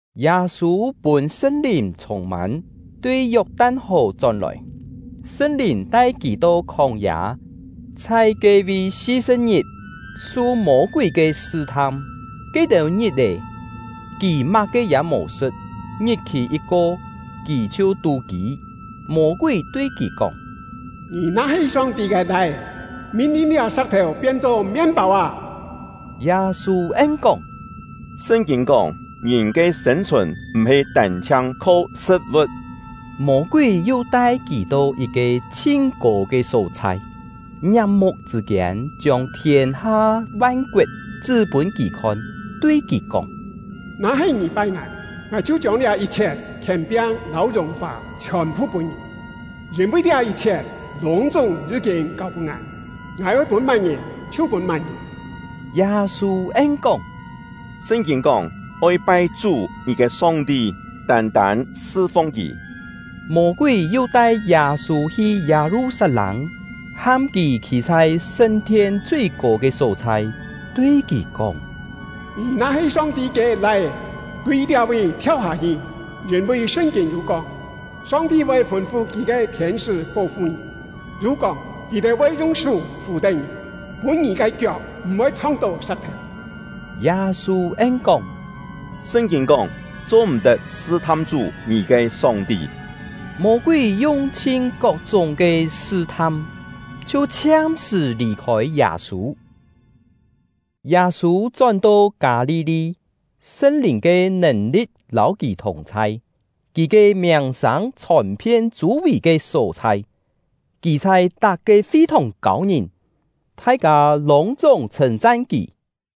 Yâ-sû pûn Sṳn-Lìn chhûng-mân, tui Yok-tan-hò chón-lòi. Sṳn-Lìn tai kì to khóng-yâ, chhai ke-vi si-sṳ̍p-ngit, su Mô-kúi ke sṳ-tham. Ke-têu ngit-è, kì má-ke ya mò sṳ̍t, ngit-khì yit-ko, kì chhiu tú-kî. Mô-kúi tui kì kóng: “Ngì na-he Song-ti ke Lai-é, min-lin liá sa̍k-thèu pien-cho mien-pâu â!” Yâ-sû en-kóng: “Sṳn-kîn kóng: ‘Ngìn ke sên-chhùn m̀-he tân-chhiang kho sṳ̍t-vu̍t.’” Mô-kúi yu tai kì to yit-ke chhin-kô ke só-chhai, ngiap-muk chṳ̂ kiên chiông thiên-ha van-koet chṳ́ pûn kì khon, tui kì kóng: “Na-he ngì pai ngài, ngài chhiu chiông liá yit-chhiet khièn-piang lâu yùng-fà chhiòn-phu pûn ngì; yîn-vi liá yit-chhiet lûng-chúng yí-kîn kâu-pûn ngài, ngài oi pûn má-ngìn chhiu pûn má-ngìn.” Yâ-sû en-kóng: “Sṳn-kîn kóng: ‘Oi pai Chú — ngì ke Song-ti, tân-tân sṳ-fung Kì.’” Mô-kúi yu tai Yâ-sû hi Yâ-lu-sat-lâng, ham kì khî chhai sṳn-thien chui-kô ke só-chhai, tui kì kóng: “Ngì na-he Song-ti ke Lai-é, tui liá-vi thiau hâ-hi; yîn-vi Sṳn-kîn yû kóng: ‘Song-ti voi fûn-fu Kì ke thiên-sṳ́ pó-fu ngì’; yu kóng: ‘Kì-têu voi yung sú fù-tén ngì, pûn ngì ke kiok m̀-voi chhong-tó sa̍k-thèu.’” Yâ-sû en-kóng: “Sṳn-kîn kóng: ‘Cho-m̀-tet sṳ-tham Chú — ngì ke Song-ti.’” Mô-kúi yung-chhin kok-chúng ke sṳ-tham, chhiu chhiam-sṳ̀ lì-khôi Yâ-sû. Yâ-sû chón-to Kâ-li-li; Sṳn-Lìn ke nèn-li̍t lâu kì thùng-chhai. Kì ke miàng-sâng chhòn-phien chû-vì ke só-chhai. Kì chhai tak-ke fi-thòng kâu ngìn, thai-kâ lûng-chúng chhṳ̂n-chan kì.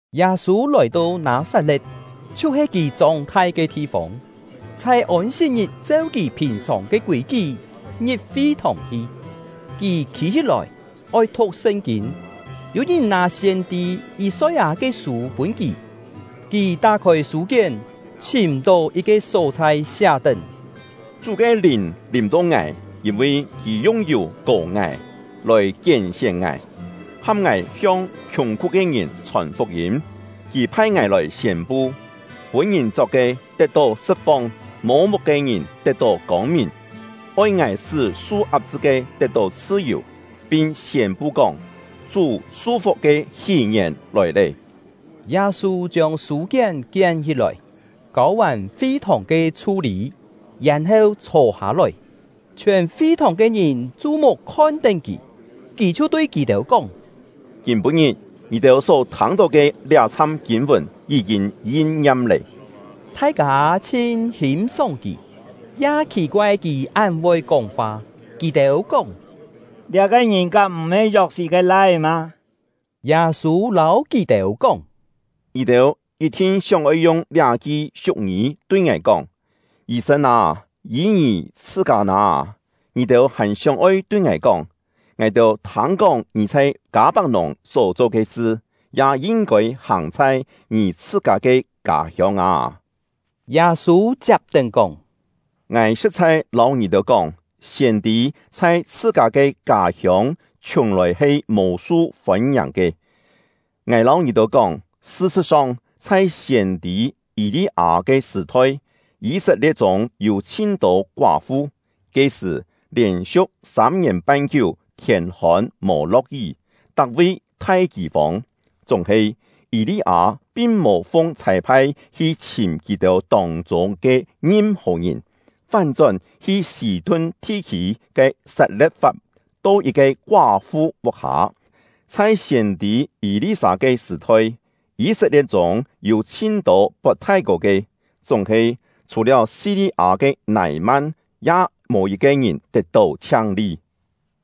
Yâ-sû lòi-to Nâ-sat-le̍t, chhiu-he kì chóng-thai ke thi-fông, chhai Ôn-sit-ngit cheu kì phìn-sòng ke kûi-kí ngi̍p fi-thòng hi. Kì khî-hí-lòi, oi thu̍k Sṳn-kîn, yû ngìn nâ siên-tî Yî-soi-â ke sû pûn kì. Kì tá-khôi sû-kién, chhìm-tó yit-ke só-chhai siá-tén: Chú ke Lìn lìm-to ngài, yîn-vi Kì yung yù kò ngài, lòi kién-sién ngài, ham ngài hiong khiùng-khú ke ngìn chhòn fuk-yîm. Kì phai ngài lòi siên-pu: Pûn-ngìn chok ke, tet-tó sṳt-fong; mô-muk ke ngìn, tet-tó kông-mìn; oi ngài sṳ́ su ap-chṳ ke tet-tó chhṳ-yù; pin siên-pu kóng: Chú su-fuk ke hí-ngièn lòi lé. Yâ-sû chiông sû-kién kién-hí-lòi, kâu-vàn fi-thòng ke chhu-lî, yèn-heu chhô-hâ-lòi. Chhiòn fi-thòng ke ngìn chu-muk khon-tén kì, kì chhiu tui kì-têu kóng: “Kîm-pû-ngit, ngì-têu só thâng-tó ke liá-chham kîn-vùn yí-kîn yin-ngiam lé.” Thai-kâ chhin hîm-sóng kì, ya khì-koai kì án voi kóng-fa. Kì-têu kóng: “Liá-ke ngìn kám m̀-he Yok-sit ke lai-é mâ?” Yâ-sû lâu kì-têu kóng: “Ngì-têu yit-thin sióng-oi yung liá-ki siu̍k-ngî tui ngài kóng: ‘Yî-sên â, yî ngì chhṳ-kâ nâ!’ Ngì-têu hàn sióng-oi tui ngài kóng: ‘Ngài-têu thâng-kóng ngì chhai Kâ-pak-nùng só-cho ke sṳ, ya yin-kôi hàng chhai ngì chhṳ-kâ ke kâ-hiông â!’” Yâ-sû chiap-tén kóng: “Ngài sṳ̍t-chhai lâu ngì-têu kóng, siên-tî chhai chhṳ-kâ ke kâ-hiông chhiùng-lòi he mò su fôn-ngiàng ke. “Ngài lâu ngì-têu kóng, sṳ-sṳ̍t-song, chhai siên-tî Yî-li-â ke sṳ̀-thoi, Yî-set-lie̍t chûng yû chhin-tô koá-fu. Ke-sṳ̀, lièn-siu̍k sâm-ngièn-pan kiú thiên-hôn mò lo̍k-yí, tak-vi thai kî-fông. Chúng-he, Yî-li-â pin-mò fung chhâi-phai hi chhìm kì-têu tông-chûng ke ngim-hò ngìn, fán-chón hi Sî-tun thi-khî ke Sat-le̍t-fap, to yit-ke koá-fu vuk-hâ. Chhai siên-tî Yî-li-sâ ke sṳ̀-thoi, Yî-set-lie̍t chûng yû chhin-tô pot thái-kô ke, chúng-he, chhù-liáu Si-li-â ke Nâi-man, ya mò yit-ke ngìn tet-tó chhiang-li.”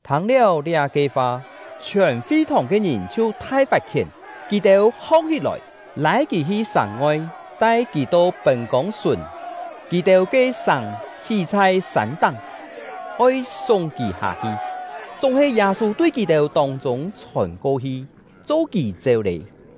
Thâng-liáu liá-ke fa, chhiòn fi-thòng ke ngìn chhiu thai fat-khién. Kì-têu hong-hí-lòi, lâi kì hi sàng-ngoi, tai kì to pên-kông-sùn (kì-têu ke sàng hí chhai sân-táng), oi súng kì hâ-hi. Chúng-he Yâ-sû tui kì-têu tông-chûng chhôn ko-hi, cho kì chéu lé.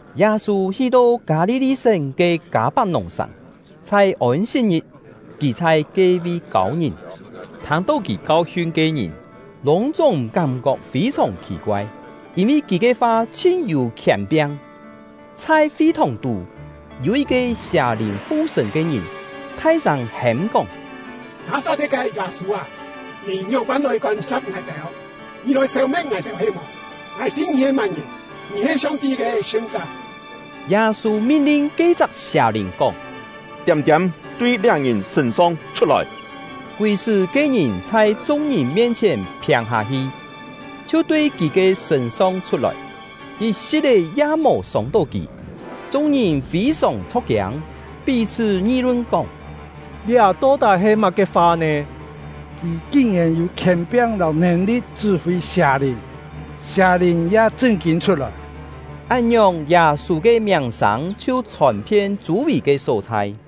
Yâ-sû hi-to Kâ-li-li-sén ke Kâ-pak-nùng-sàng. Chhai Ôn-sit-ngit, kì chhai ke-vi kâu ngìn. Thâng-tó kì kau-hiun ke ngìn lûng-chúng kám-kok fî-sòng khì-koai, yîn-vi kì ke fa chhin yû khièn-piang. Chhai fi-thòng-tú, yû yit-ke sià-lìn fu-sṳ̂n ke ngìn, thai-sâng hêm-kóng: “Nâ-sat-le̍t ke Yâ-sû â, ngì ngióng-pân lòi kôn-sa̍p ngài-têu? Ngì lòi sêu-me̍t ngài-têu he-mò? Ngài tî ngì he má-ngìn; ngì he Song-ti ke Sṳn-chá!” Yâ-sû min-lin ke-chak sià-lìn kóng: “Tiâm-tiâm, tui liá ngìn sṳ̂n-song chhut-lòi!” Kúi sṳ́ ke-ngìn chhai chung-ngìn mien-chhièn phiâng-hâ-hi, chhiu tui kì ke sṳ̂n-song chhut-lòi, yit-si̍t-é ya mò sông-tó kì. Chung-ngìn fî-sòng chho̍k-kiâng, pí-chhṳ́ ngi-lun kóng: “Liá to-tái he má-ke fa nè! Kì kin-yèn yû khièn-piang lâu nèn-li̍t chṳ́-fî sià-lìn, sià-lìn ya chṳn-kîn chhut-lòi!” Án-ngiòng, Yâ-sû ke miàng-sâng chhiu chhòn-phien chû-vì ke só-chhai.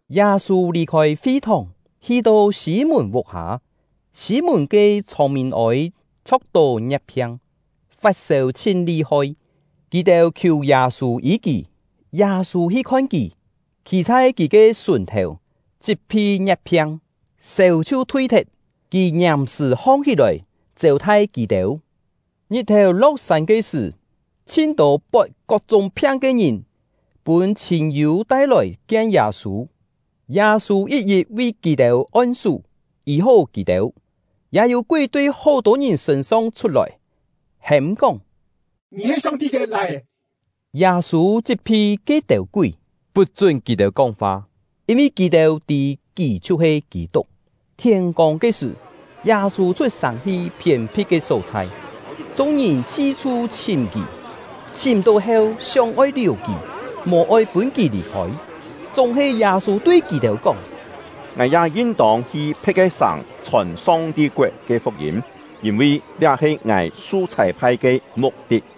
Yâ-sû lì-khôi fi-thòng, hi-to Sî-mùn vuk-hâ. Sî-mùn ke chhông-mîn-ôi chho̍k-tó ngie̍t-phiang, fat-sêu chhin li-hoi; kì-têu khiù Yâ-sû yî kì. Yâ-sû hi khon kì, khî chhai kì ke sùn-thèu, chit-phi ngie̍t-phiang, sêu chhiu thui-thet. Kì ngiàm-sṳ̀ hong-hí-lòi, chêu-thai kì-têu. Ngit-thèu lo̍k-sân ke sṳ̀, chhin-tô pot kok-chúng phiang ke ngìn pûn chhîn-yû tai-lòi kien Yâ-sû; Yâ-sû yit-yit vi kì-têu on-sú, yî-hó kì-têu. Ya yû kúi tui hó-tô ngìn sṳ̂n-song chhut-lòi, hêm-kóng: “Ngì he Song-ti ke Lai-é!” Yâ-sû chit-phi ke-têu kúi, put-chún kì-têu kóng-fa, yîn-vi kì-têu tî kì chhiu-he Kî-tuk. Thiên-kông ke sṳ̀, Yâ-sû chhut-sàng hi phiên-phit ke só-chhai. Chung-ngìn si-chhu chhìm kì, chhìm-tó heu, sióng-oi liù kì, mò-oi pûn kì lì-khôi. Chúng-he Yâ-sû tui kì-têu kóng: “Ngài ya yin-tông hi phe̍t ke sàng chhòn Song-ti koet ke fuk-yîm, yîn-vi liá he ngài su chhâi-phai ke muk-tit.”